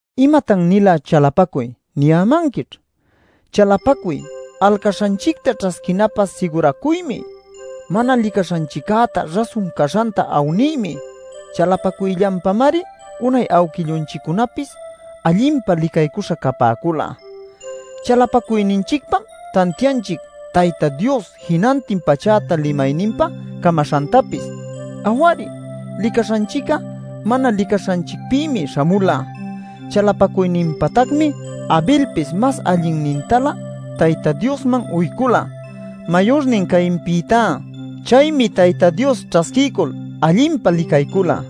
“¿Imatan-nila chalapacuy?” niyämanquićh. Chalapacuy, alcaśhanchicta ćhasquinapä siguracuymi; mana licaśhanchiccäta rasun caśhanta awniymi. Chalapacuyllanpamari unay awquillunchiccunapis allinpa licaycuśha capäcula. Chalapacuyninchicpam tantianchic Tayta Dios jinantin pachäta limayninpa camaśhantapis; aw-ari, licaśhanchic'a mana licaśhanchicpïmi śhamula. Chalapacuyninpatacmi Abelpis mas allinnintalä Tayta Diosman uycula, mayurnin Cainpïtá. Chaymi Tayta Dios ćhasquiycul allinpa licaycula.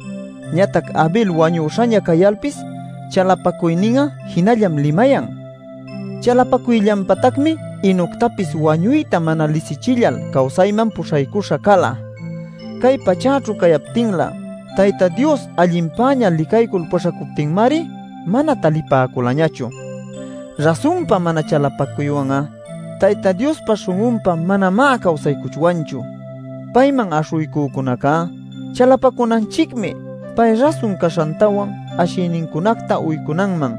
Ñatac Abel wañüśhaña cayalpis chalapacuynin'a jinallam limayan. Chalapacuyllanpatacmi Enoctapis wañuyta mana lisichillal cawsayman puśhaycuśha cala. Cay pachäćhu cayaptinlä Tayta Dios allinpäña licaycul puśhacuptinmari mana talipäculañachu. Rasunpa mana chalapacuywan'a Tayta Diospa śhun'unpa manamá cawsaycuchwanchu. Payman aśhuycücunaca chalapacunanchicmi pay rasun caśhantawan ashïnincunacta uycunanman.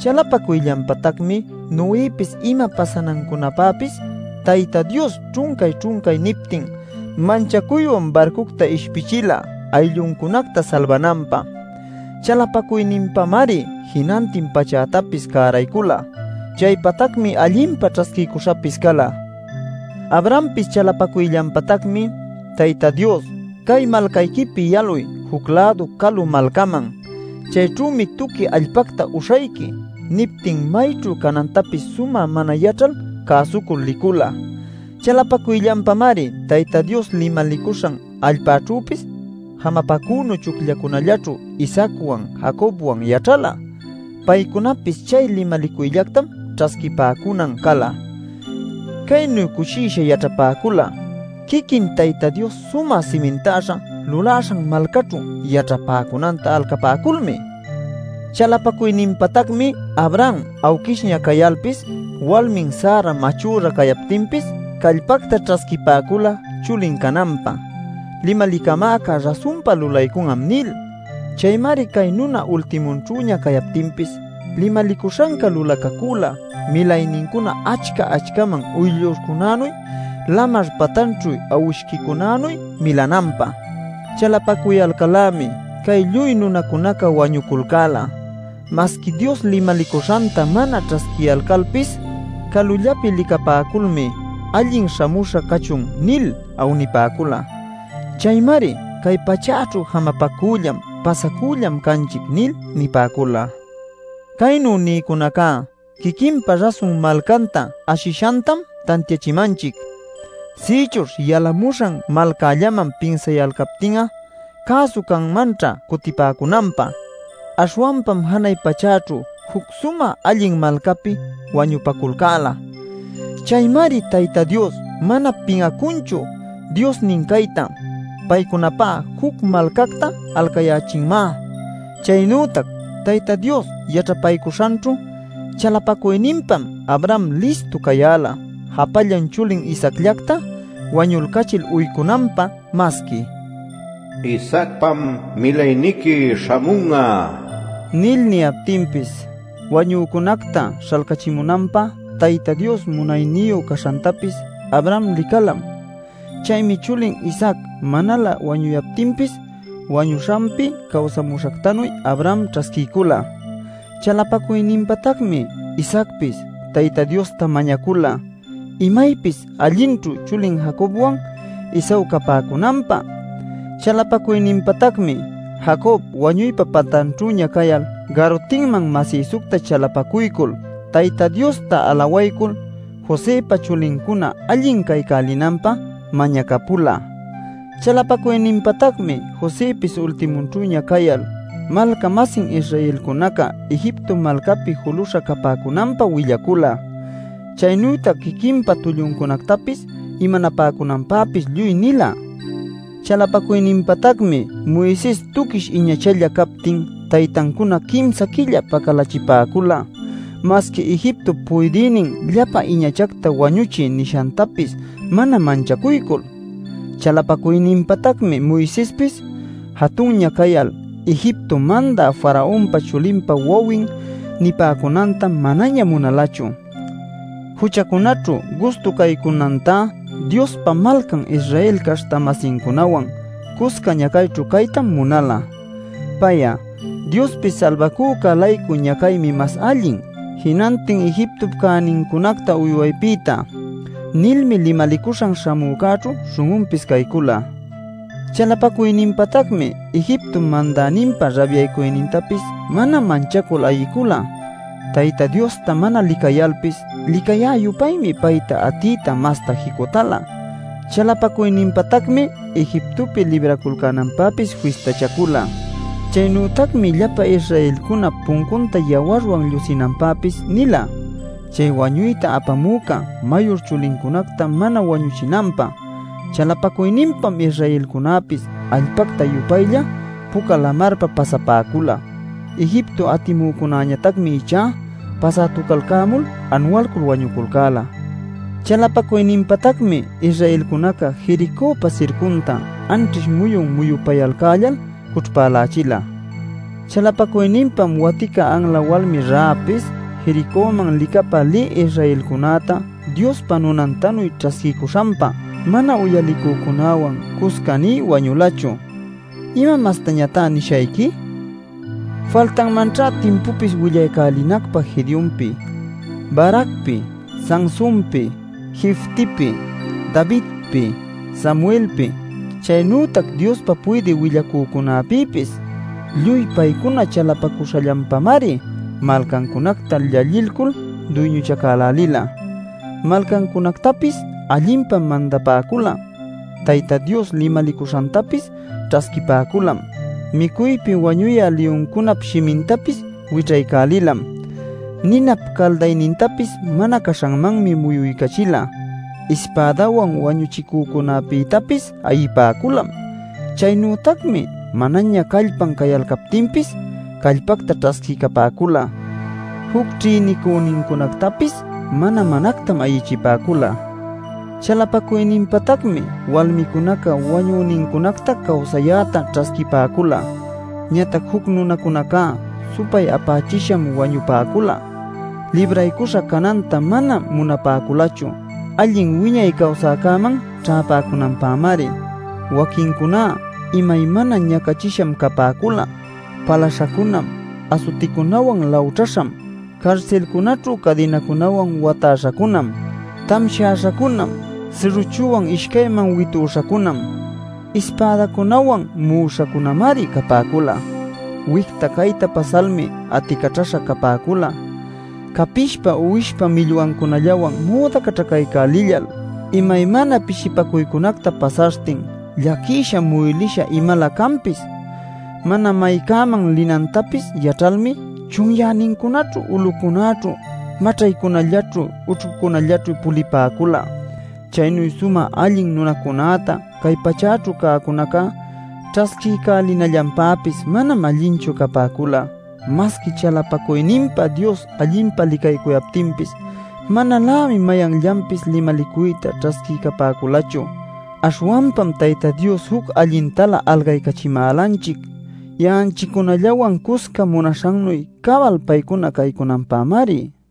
Chalapacuyllanpatacmi Noëpis ima pasanancunapäpis Tayta Dios ćhuncay-ćhuncay niptin, manchacuywan barcucta ishpichila aylluncunacta salbananpä. Chalapacuyninpamari jinantin pachätapis cäraycula; chaypatacmi allinpa ćhasquiycuśhapis cala. Abrahampis chalapacuyllanpatacmi Tayta Dios: “Cay malcayquipi yaluy juc-lädu calu malcaman; chayćhümi tuqui allpacta uśhayqui” niptin mayćhu canantapis sumä mana yaćhal cäsucul licula. Chalapacuyllanpamari Tayta Dios limalicuśhan allpaćhüpis jamapacünu chucllacunallaćhu Isaacwan Jacobwan yaćhala. Paycunapis chay limalicuyllactam ćhasquipäcunan cala. Caynu cushisha yaćhapäcula quiquin Tayta Dios sumä simintäśha lulaśhan malcaćhu yaćhapäcunanta alcapäculmi. Chalapacuyninpatacmi Abraham awquishña cayalpis walmin Sara machüra cayaptinpis callpacta ćhasquipäcula chulin cananpä “Limalicamäca rasunpa lulaycun'am” nil. Chaymari cay nuna ultimunćhüña cayaptinpis limalicuśhanca lulacacüla milaynincuna achca-achcaman uyllurcunänuy lamar patanćhu awishquicunänuy milananpä. Chalapacuyalcal-lämi cay lluy nunacunaca wañuculcäla. Masqui Dios limalicuśhanta mana ćhasquiyalcalpis calullapi licapäculmi “Allin śhamuśha cachun” nil awnipäcula. Chaymari “Cay pachäćhu jamapacüllam, pasacüllam canchic” nil nipäcula. Caynu nïcunacá quiquinpa rasun malcanta ashishantam tantiachimanchic. Sïchuśh yalamuśhan malcallaman pinsayalcaptin'a cäsu canmanćha cutipäcunanpä. Aśhwanpam janay pachäćhu juc sumä allin malcapi wañupaculcäla. Chaymari Tayta Dios mana pin'acunchu Diosnin cayta; paycunapä juc malcacta alcayächinmá. Chaynütac Tayta Dios yaćhapaycuśhanćhu chalapacuyninpam Abraham listu cayäla japallan chulin Isaacllacta wañulcachil uycunanpä masqui “Isaacpam milayniqui śhamun'a” nil niyaptinpis. Wañücunacta śhalcachimunanpä Tayta Dios munayniyu caśhantapis Abraham licalam. Chaymi chulin Isaac manalä wañuyaptinpis wañüśhapi cawsamuśhactanuy Abraham ćhasquiycula. Chalapacuyninpatacmi Isaacpis Tayta Diosta mañacula imaypis allinćhu chulin Jacobwan Esaú capäcunanpä. Chalapacuyninpatacmi Jacob wañuypa patanćhüña cayal garutinman masïsucta chalapacuycul, Tayta Diosta alawaycul, Josëpa chulincuna allin caycälinanpä mañacapula. Chalapacuyninpatacmi Josëpis ultimunćhüña cayal, malca-masin Israelcunaca Egipto malcapi juluśha capäcunanta willacula. Chaynütac quiquinpa tulluncunactapis imanapäcunanpäpis lluy nila. Chalapacuyninpatacmi Moises tuquish iñachalla captin taytancuna quimsa quilla pacalächipäcula masqui Egiptop puydïnin “Llapa iñachacta wañuchiy” nishantapis mana manchacuycul. Chalapacuyninpatacmi Moisespis jatunña cayal Egipto mandä Faraonpa chulinpa wawin nipäcunanta manaña munalachu. Juchacunaćhu gustu caycunantá Diospa malcan Israel caśhta-masincunawan cusca ñacayćhu caytam munala. Pay'a “Diospi Salbacücä-laycu ñacaymi mas allin jinantin Egiptop cänincunacta uywaypïtá” nilmi limalicuśhan śhamücäćhu śhun'unpis caycula. Chalapacuyninpatacmi Egiptop mandäninpa rabyacuynintapis mana manchacul ayicula; Tayta Diosta mana licayalpis licayä-yupaymi payta atiyta masta jicutäla. Chalapacuyninpatacmi Egiptopi libraculcänanpäpis fistachacula. Chaynütacmi llapa Israelcuna puncunta yawarwan llusinanpäpis nila chay wañuyta apamüca mayur chulincunacta mana wañuchinanpä. Chalapacuyninpam Israelcunäpis allpacta-yupaylla puca lamarpa pasapäcula. Egipto atimücunäñatacmi ichá pasätuculcämul anualcul wañuculcäla. Chalapacuyninpatacmi Israelcunaca Jericöpa sircunta anćhish muyun muyupayalcällal cućhpälächila. Chalapacuyninpam watica anla walmi Rahabpis Jericöman licapä lï Israelcunäta Diospa nunantanuy ćhasquiycuśhanpa mana uyalicücunäwan cusca nï wañulachu. ¿Ima mastañatá nishayqui? Faltanmanćha timpupis willaycälinacpä Gedeonpi, Baracpi, Sansunpi, Jeftipi, Davidpi, Samuelpi, chaynütac Diospa puydï willacücunapïpis. Lluy paycuna chalapaculcäśhallanpamari malcacunacta llallilcul duyñuchacaycälila. Malcacunactapis allinpam mandapäcula. Tayta Dios limalicuśhantapis ćhasquipäculam. Micuypi wañuyä liyuncunap shimintapis wićhaycälilam. Ninap caldaynintapis mana caśhanmanmi muyuycachila. Ispädawan wañuchicücunapïtapis ayipäculam. Chaynütacmi manaña callpan cayalcaptinpis callpacta ćhasquiycapäcula; juc ćhïnicünincunactapis mana-manactam ayichipäcula. Chalapacuyninpatacmi walmicunaca wañünincunacta cawsayäta ćhasquipäcula. Ñatac juc nunacunacá supay-apachisham wañupäcula; libraycuśha cananta mana munapäculachu allin wiñay cawsaycäman ćhäpäcunanpämari. Waquincuná imaymana ñacachisham capäcula, palaśhacunam, asuticunawan lawćhäśham, carsilcunaćhu cadinacunawan watäśhacunam, tamshäśhacunam, sirrüchuwan ishcayman witüśhacunam, ispädacunawan mu'uśhacunamari capäcula. Wicta cayta pasalmi aticaćhaśha capäcula capishpa uwishpa millwancunallawan müdacaćhacaycälillal, imaymana pishipacuycunacta pasaśhtin, llaquisha muylïsha imalä canpis. Mana maycäman linantapis yaćhalmi chunyänincunaćhu, ulucunäćhu, maćhaycunallaćhu ućhcucunallaćhu pulipäcula. Chaynu sumä allin nunacunäta cay pachäćhu cäcunaca ćhasquiycälinallanpäpis manam allinchu capäcula. Masqui chalapacuyninpa Dios allinpa licaycuyaptinpis manalämi mayanllanpis limalicuyta ćhasquiycapäculachu. Aśhwanpam Tayta Dios juc allintalä alcaycachimälanchic; ya'anchiccunallawan cusca munaśhannuy cabal paycuna caycunanpämari.